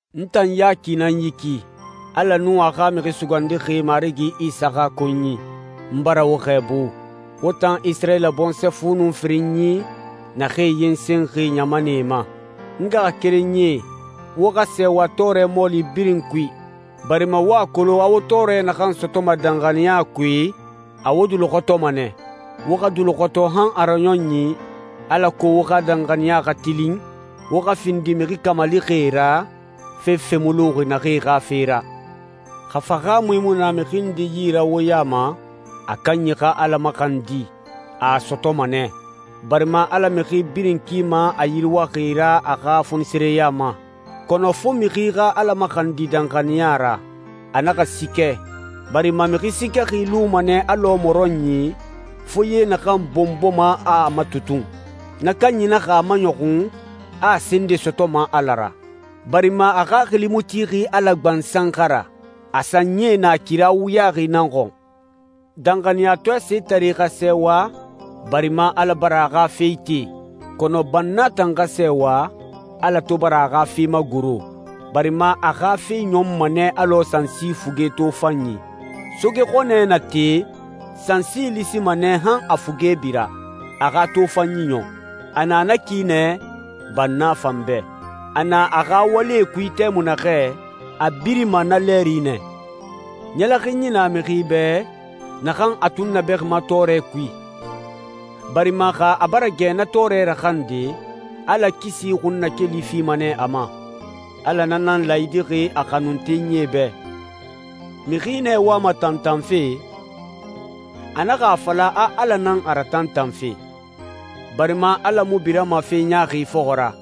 N tan Yaki nan yi ki, Ala nun a xa Mixi Sugandixi Marigi Isa xa konyi. N bara wo xɛɛbu, wo tan Isirayila bɔnsɔɛ fu nun firinyi naxee yensenxi ɲamanɛe ma. N ngaxakerenyie, wo xa sɛɛwa tɔɔrɛ mɔɔli birin kui, barima wo a kolon a wo tɔɔrɛ naxan sɔtɔma danxaniya kui, a wo duluxɔtɔma nɛ. Wo xa duluxɔtɔ han a raɲɔnyi alako wo xa danxaniya xa tilin, wo xa findi mixi kamalixie ra, fefe mu luxi naxee xa fe ra. Xa fahaamui mu na mixi nde yi ra wo ya ma, a kanyi xa Ala maxandi. A a sɔtɔma nɛ, barima Ala mixi birin kima a yiriwaxi ra a xa fonisireya ma. Kɔnɔ fo mixi xa Ala maxandi danxaniya ra, a naxa siikɛ, barima mixi siikɛxi luma nɛ alɔ mɔrɔnyi, foye naxan bɔnbɔma, a a matutun. Na kanyi naxa a maɲɔxun a a se nde sɔtɔma Ala ra, barima a xaxili mu tixi Ala gbansan xa ra, a sanyie na kira wuyaxi nan xɔn. Danxaniyatɔɛ setare xa sɛɛwa barima Ala bara a xa fe ite. Kɔnɔ banna tan xa sɛɛwa Ala to bara a xa fe magoro, barima a xa fe ɲɔnma nɛ alɔ sansi fuge tofanyi. Soge xɔnɛ na te, sansi lisima nɛ han a fuge bira, a xa tofanyi ɲɔn. A na na ki nɛ banna fan bɛ. A na a xa walie kui tɛmui naxɛ, a birima na lɛɛri nɛ. Ɲɛlɛxinyi na mixi bɛ naxan a tunnabɛxima tɔɔrɛ kui, barima xa a bara gɛ na tɔɔrɛ raxande, Ala kisi xunnakeli fima nɛ a ma. Ala na nan laayidixi a xanuntenyie bɛ. Mixi nɛ wama tantanfe, a naxa a fala a Ala nan a ratantanfe, barima Ala mu birama fe ɲaaxi fɔxɔ ra,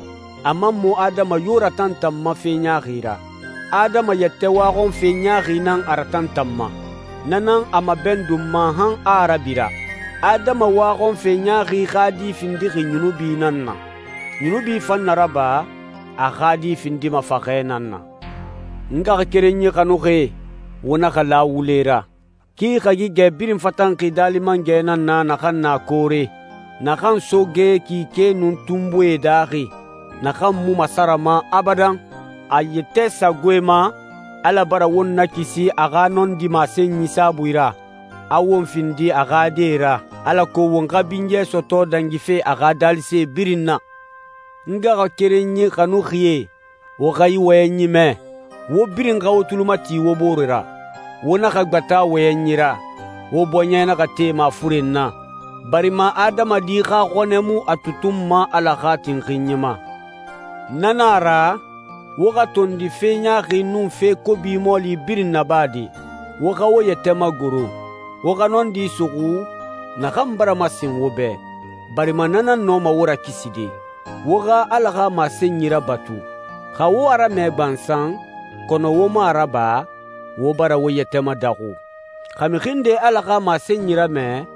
a man mu adama yo ratantanma fe ɲaaxi ra. Adama yɛtɛ waxɔnfe ɲaaxi nan a ratantanma. Na nan a mabɛndunma han a a rabira. Adama waxɔnfe ɲaaxi xa di findixi yunubi nan na. Yunubi fan na raba, a xa di findima faxɛ nan na. N ngaxakerenyi xanuxie, wo naxa la wule ra. Ki hagigɛ birin fatanxi Daali Mangɛ nan na naxan na koore, naxan soge, kike, nun tunbuie daaxi, naxan mu masarama abadan. A yɛtɛ sagoe ma, Ala bara won nakisi a xa nɔndi masenyi saabui ra, a won findi a xa die ra, alako won xa binyɛ sɔtɔ dangife a xa daalise birin na. N ngaxakerenyi xanuxie, wo xa yi wɔyɛnyi mɛ: Wo birin xa wo tuli mati wo bore ra, wo naxa gbata wɔyɛnyi ra, wo bɔɲɛ naxa te mafuren na, barima adamadi xa xɔnɛ mu a tutunma Ala xa tinxinyi ma. Na na a ra, wo xa tondi fe ɲaaxi nun fe kobi mɔɔli birin nabade. Wo xa wo yɛtɛ magoro, wo xa nɔndi suxu naxan bara masen wo bɛ, barima na nan nɔma wo rakiside. Wo xa Ala xa masenyi rabatu. Xa wo a ramɛ gbansan kɔnɔ wo mu a raba, wo bara wo yɛtɛ madaxu. Xa mixi nde Ala xa masenyi ramɛ,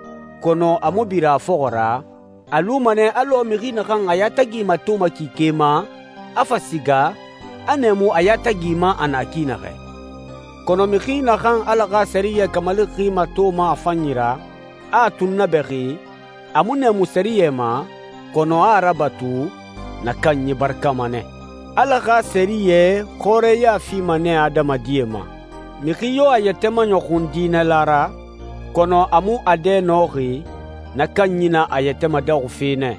kɔnɔ a mu bira a fɔxɔ ra, a luma nɛ alɔ mixi naxan a yatagi matoma kike ma, a fa siga, a nɛɛmu a yatagi ma a na ki naxɛ. Kɔnɔ mixi naxan Ala xa sɛriyɛ kamalixi matoma a fanyi ra, a a tunnabɛxi, a mu nɛɛmu sɛriyɛ ma kɔnɔ a a rabatu, na kanyi barakama nɛ. Ala xa sɛriyɛ xɔrɛya fima nɛ adamadie ma. Mixi yo a yɛtɛ maɲɔxun diinɛla ra, kɔnɔ a mu a dɛ nɔxi, na kanyi na a yɛtɛ madaxufe nɛ.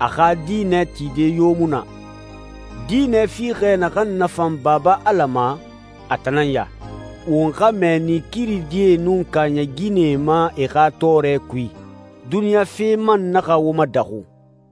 A xa diinɛ tide yo mu na. Diinɛ fiixɛ naxan nafan Baba Ala ma, a tan nan ya: won xa mɛɛni kiridie nun kaaɲɛ ginɛe ma e xa tɔɔrɛ kui, duniɲa fe man naxa wo madaxu.